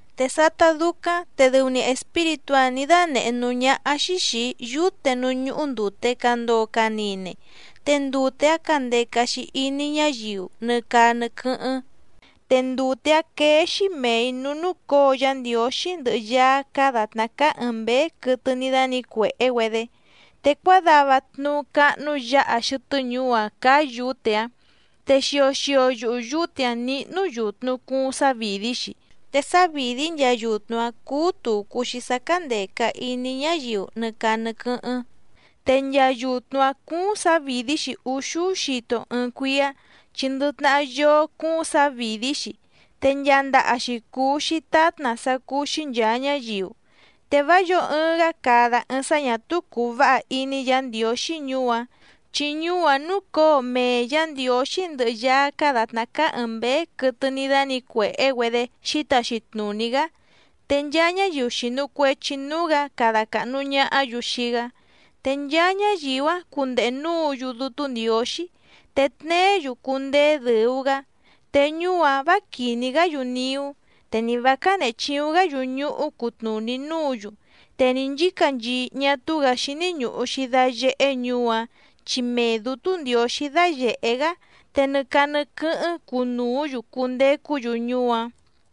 Te sátá dúcáⁿ te dɨu‑ni espíritú‑áⁿ nǐ dánèhé núú ñáhá‑xí xìi‑í yúte núú ñúhú ndùte candoo canine, te ndute‑áⁿ candeca‑xi iní ñáyiu nɨ caa nɨ quɨ́hɨ́ⁿ, te ndute‑áⁿ quéé‑xí mèi núú núcǒo Yá Ndiǒxí ndɨhɨ Yaá cáá dàtná cáá ɨ̀ɨⁿ mbéé quɨtɨ ní dánǐcuèhé‑güedé. Te cuádava tnuú cáhnú yǎha xɨtɨ́ ñuú‑áⁿ cáá yǔte‑áⁿ, te xio xio yuhu yǔte‑áⁿ níhnú yùtnu cuuⁿ sávìdí‑xi, te sávìdí nchaa yutnu‑áⁿ cúú tùcu‑xi sá cándèca iní ñáyiu nɨ caa nɨ quɨ́hɨ́ⁿ, te nchaa yutnu‑áⁿ cúúⁿ sǎvìdí‑xi úxúú xito ɨɨⁿ cuíá chi ndɨ tnahá yóó cúúⁿ sǎvìdí‑xi, te nchaa ndaha‑xi cùu‑xi tátna sá cúú‑xí nchàa ñáyiu. Te vá yǒo ɨɨⁿ‑gá cada ɨɨⁿ sá ñà túú cùu váha iní Yǎ Ndiǒxí ñuú‑áⁿ. Chi ñuú‑áⁿ núcǒo mee Yǎ Ndiǒxí ndɨhɨ Yaá cáá dàtná cáá ɨ̀ɨⁿ mbéé quɨtɨ ní dánǐcuèhé‑güedé xǐtaxi tnùní‑gá, te nchaa ñáyiu xìnu cuechi núú‑gǎ cada càhnu ñahá‑yu xii‑gá. Te nchaa ñáyiu‑áⁿ cundehe núǔ‑yu Dútú Ndiǒxí, te tneé‑yu cundeé dɨ̀u‑gá. Te ñuú‑áⁿ vǎ quìní‑gá‑yu niú, te ni vǎ cánèhe chiuⁿ‑gá‑yu ñuhú cutnùní núǔ‑yu, te ni nchǐcanchii ñá túú‑gǎ xíní ñùhu‑xi dayehé ñuú‑áⁿ chi mee Dǔtú Ndiǒxí dáyèhé‑gá, te nɨ caa nɨ quɨ́hɨ́ⁿ cunùú‑yu cundecú‑yu ñuú‑áⁿ.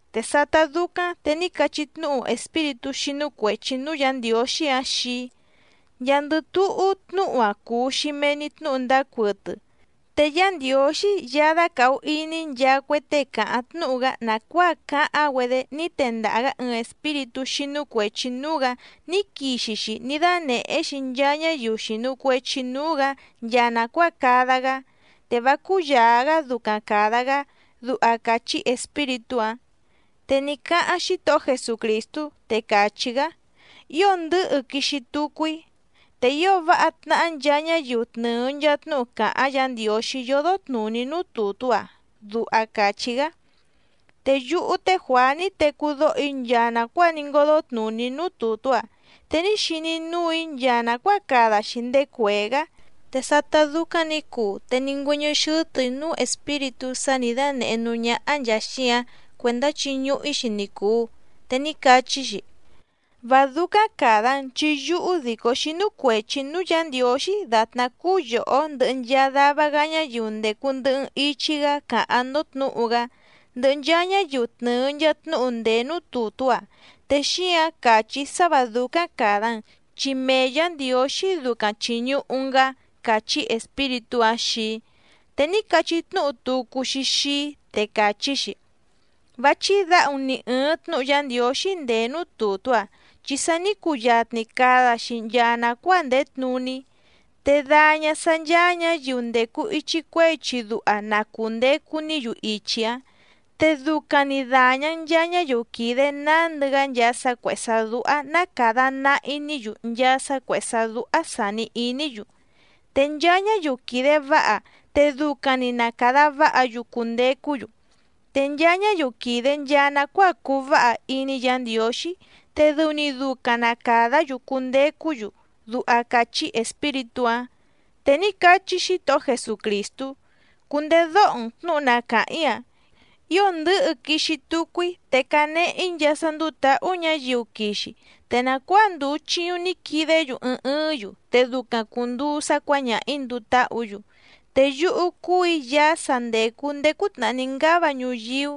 Te sátá dúcáⁿ te ní cachí tnúhu espíritú xínú cuèchi núú Yǎ Ndiǒxí‑áⁿ xii‑í: —Nchaandɨ túhú tnúhu‑a cùu‑xi mee‑ni tnúhu ndáá cuɨtɨ. Te Yá Ndiǒxí Yaá dácàhu iní nchaa cue tée càháⁿ tnúhu‑gá nàcuáa cáháⁿ‑güedé ní tendaha‑gǎ ɨɨⁿ espíritú xínú cuèchi núú‑gǎ ní quixi‑xi ní dánèhé‑xi nchaa ñáyiu xìnu cuechi núú‑gǎ nchaa nàcuáa cada‑gá, te vá cúyàa‑gá ducaⁿ càda‑gá —duha càchí espíritú‑áⁿ. Te ní cáháⁿ Xítohó Jesucrìstú, te càchí‑gá: —¡Ío ndɨ̌hɨ quixi tucu‑í! ’¡Te ío váha tnahá nchaa ñáyiu tnɨ̀ɨ nchaa tnúhu càháⁿ Yǎ Ndiǒxí yódó tnùní núú tùtú‑a! —duha càchí‑gá. Te yúhú té Juàá ní tecú dóho‑í nchaa nàcuáa ní ngódó tnùní núú tùtú‑a, te ní xiní núù‑í nchaa nàcuáa cada‑xi ndéé cuèé‑gá. Te sátá dúcáⁿ nǐ cuu te ní ngüɨ́ñɨ́ xɨ́tɨ̀‑í núú espíritú sá nǐ dánèhé núú ñáhá nchàa xíǎⁿ cuèndá chiñuhu‑ǐ‑xi ni cùu. Te ní cachí‑xi: —Vá dúcáⁿ càda‑n, chi yúhú dìcó xínú cuèchi‑í núú Yǎ Ndiǒxí dàtná cúú yòhó ndɨhɨ nchaa dava‑gá ñáyiu ndècu ndɨhɨ‑n ichi‑gá càháⁿ‑ndó tnǔhu‑gá, ndɨhɨ nchaa ñáyiu tnɨ̀ɨ nchaa tnúhu ndèé núú tùtú‑a, te xíǎⁿ càchí‑í sá vǎ dúcáⁿ càda‑n, chi mee Yǎ Ndiǒxí ducaⁿ chìñuhu‑n‑gá —càchí espíritú‑áⁿ xii‑í. Te ní cachí tnúhu tucu‑xi xii‑í, te càchí‑xi: —Vá chídǎhu‑n nì ɨɨⁿ tnúhu Yá Ndiǒxí ndèé núú tùtú‑a, chi sa ní cuyatni cada‑xi nchaa nàcuáa ndèé tnuní. Te daña sǎ ncháá ñǎyiu ndècu ichi cuehé ichi duha na cùndecu‑ní‑yu ichi‑áⁿ, te ducaⁿ‑ni dàña‑n nchaa ñáyiu quìde nándɨ‑gá nchaa sá cuèhé sá dúhá ná càda nahi‑ní‑yu nchaa sá cuèhé sá dúhá sàni iní‑yu, te nchaa ñáyiu quìde váha te ducaⁿ‑ni na càda váha‑yu cundecú‑yu, te nchaa ñáyiu quìde nchaa nacuáa cùu váha iní Yǎ Ndiǒxí te dɨu‑ni ducaⁿ na càdá‑yu cundecú‑yu —duha càchí espíritú‑áⁿ. Te ní cachí Xítohó Jesucrìstú: —Cundedóho‑n tnǔhu na càháⁿ‑í‑a. Ío ndɨ̌hɨ quixi tucu‑í, te canehe‑í nchaa sá ndúú tǎhú ñǎyiu quixi, te nàcuáa ndùu chiuⁿ ní quidé‑yu ɨɨⁿ ɨɨ́ⁿ‑yu te ducaⁿ cùnduu sá cuǎñaha‑ǐ nduu táhǔ‑yu. Te yúhú cúù‑í Yaá sa ndècu ndéé cútnàhá ní ngáva ñuyíú,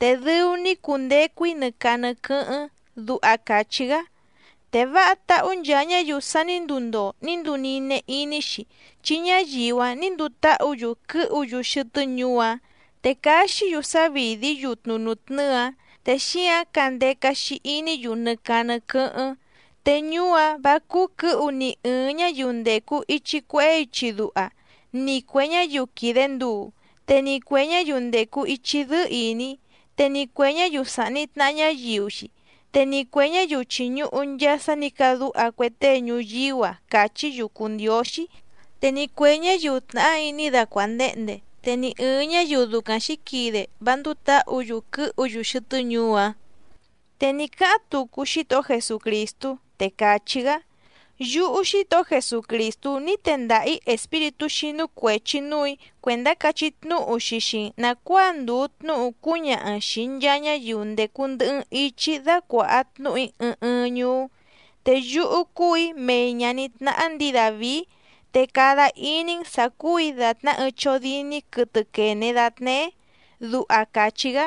te dɨu‑ni‑í cundecu‑í nɨ caa nɨ quɨ́hɨ́ⁿ —duha càchí‑gá. Te váha táhú nchaa ñáyiu sa ní nduu ndoo ní nduu nine iní‑xi, chi ñáyiu‑áⁿ nǐ nduu táhǔ‑yu quɨ́hu‑yu xɨtɨ́ ñuú‑áⁿ, te caxí‑yu sávìdí yutnu nùtnɨ́ɨ‑áⁿ te xíǎⁿ candeca‑xi iní‑yu nɨ caa nɨ quɨ́hɨ́ⁿ. Te ñuú‑áⁿ vǎ cúú quɨ̌hu ni ɨ̀ɨⁿ ñáyiu ndècu ichi cuehé ichi duha, ni cuè ñáyiu quìde nduu, te ni cuè ñáyiu ndècu ichi dɨ́ɨ́ ìní, te ni cuè ñáyiu sàhni tnaha ñáyiu‑xi, te ni cuè ñáyiu chìñuhu nchaa sá nǐ cadúha cue tée ñuyíú‑a càchí‑yu cùu ndióxí, te ni cuè ñáyiu tnàhá iní dacuàndehnde, te ni ɨ̀ɨⁿ ñáyiu ducaⁿ xǐquide vá ndúú tǎhǔ‑yu quɨ̌hu‑yu xɨtɨ́ ñuú‑áⁿ. Te ní cáháⁿ tucu Xítohó Jesucrìstú, te càchí‑gá: —Yúhú Xítohó Jesucrìstú ní tendaha‑ǐ espíritú xínú cuèchi núù‑í cuèndá cachí tnúhu‑xi xii‑n nàcuáa ndùu tnúhu cúñaha‑n xìi nchaa ñáyiu ndècu ndɨhɨ‑n ichi‑í dácuàha tnúhu‑í ɨɨⁿ ɨɨⁿ ñuú. Te yúhú cúù‑í mei ñàní tnáhá ndǐi Dàvií, te cada iní‑n sǎ cúù‑í dàtná ɨɨⁿ chódíní quɨtɨ quène datneé —duha càchí‑gá.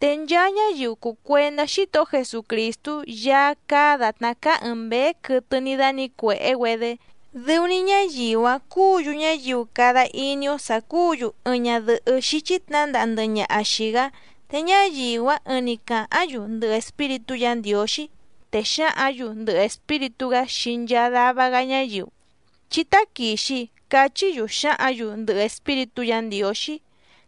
Te nchaa ñáyiu cùu cuendá Xítohó Jesucrìstú Yaá cáá dàtná cáá ɨ̀ɨⁿ mbéé quɨtɨ ní dánǐcuèhé‑güedé, dɨu‑ni ñáyiu‑áⁿ cúǔ‑yu ñáyiu cada iní‑ó sǎ cúǔ‑yu ɨɨⁿ ñadɨ̀hɨ́ xíchí tnǎndaha ndɨhɨ ñaha xìi‑gá, te ñáyiu‑áⁿ ɨɨⁿ‑ni càháⁿ‑yu ndɨhɨ Espíritú Yǎ Ndiǒxí, te xǎhǎⁿ‑yu ndɨhɨ Espíritú‑gá xii nchaa dava‑gá ñáyiu: —Chí táquìxi —cachí‑yu xǎhǎⁿ‑yu ndɨhɨ Espíritú Yǎ Ndiǒxí.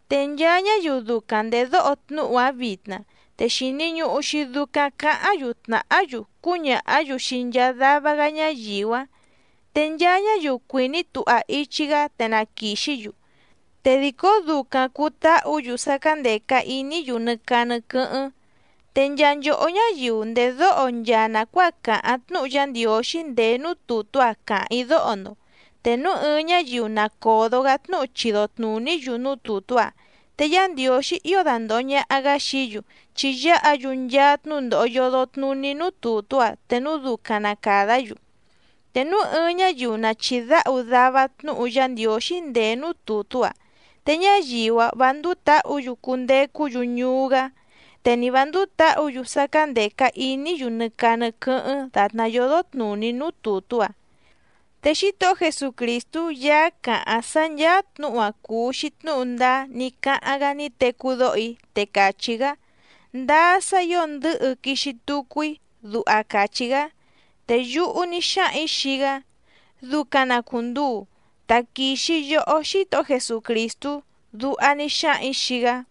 Te nchaa ñáyiu ducaⁿ ndèdóho tnúhu‑áⁿ vitna, te xìni ñuhu‑xi ducaⁿ cáháⁿ‑yu tnàhá‑yu cúñàhá‑yu xii nchaa dava‑gá ñáyiu‑áⁿ, te nchaa ñáyiu cuìní tuha ichi‑gá te na quìxí‑yu, te dìcó ducaⁿ cùu táhǔ‑yu sá cándèca iní‑yu nɨ caa nɨ quɨ́hɨ́ⁿ. Te nchaa nchòhó ñáyiu ndèdóho nchaa nàcuáa càháⁿ tnúhu Yá Ndiǒxí ndèé núú tùtú‑a càháⁿ‑í dóho‑ndo. Te núu ɨɨⁿ ñáyiu na còdo‑gá tnúhu chido tnùní‑yu núú tùtú‑a, te Yá Ndiǒxí ío dandòho ñaha‑gá xií‑yu chi yáha‑yu nchaa tnúndòho yodo tnuní núú tùtú‑a te núu ducaⁿ na càdá‑yu. Te núu ɨɨⁿ ñáyiu na chìdáhu dava tnúhu Yá Ndiǒxí ndèé núú tùtú‑a te ñáyiu‑áⁿ vǎ ndúú tǎhǔ‑yu cundecú‑yu ñuú‑gá, te ni vǎ ndúú tǎhǔ‑yu sá cándèca iní‑yu nɨ caa nɨ quɨ́hɨ́ⁿ dàtná yódó tnùní núú tùtú‑a. Te Xítohó Jesucrìstú Yaá càháⁿ sá ncháá tnǔhu‑a cùu‑xi tnúhu ndáá ní cáháⁿ‑gá ní tecú dóho‑í, te càchí‑gá: —Ndáá sá ǐo ndɨ̌hɨ quixi tucu‑í —duha càchí‑gá. Te yúhú ní xáhaⁿ‑ǐ xii‑gá: —Ducaⁿ na cùnduu, taquìxi yohó Xítohó Jesucrìstú —duha ní xáhaⁿ‑ǐ xii‑gá.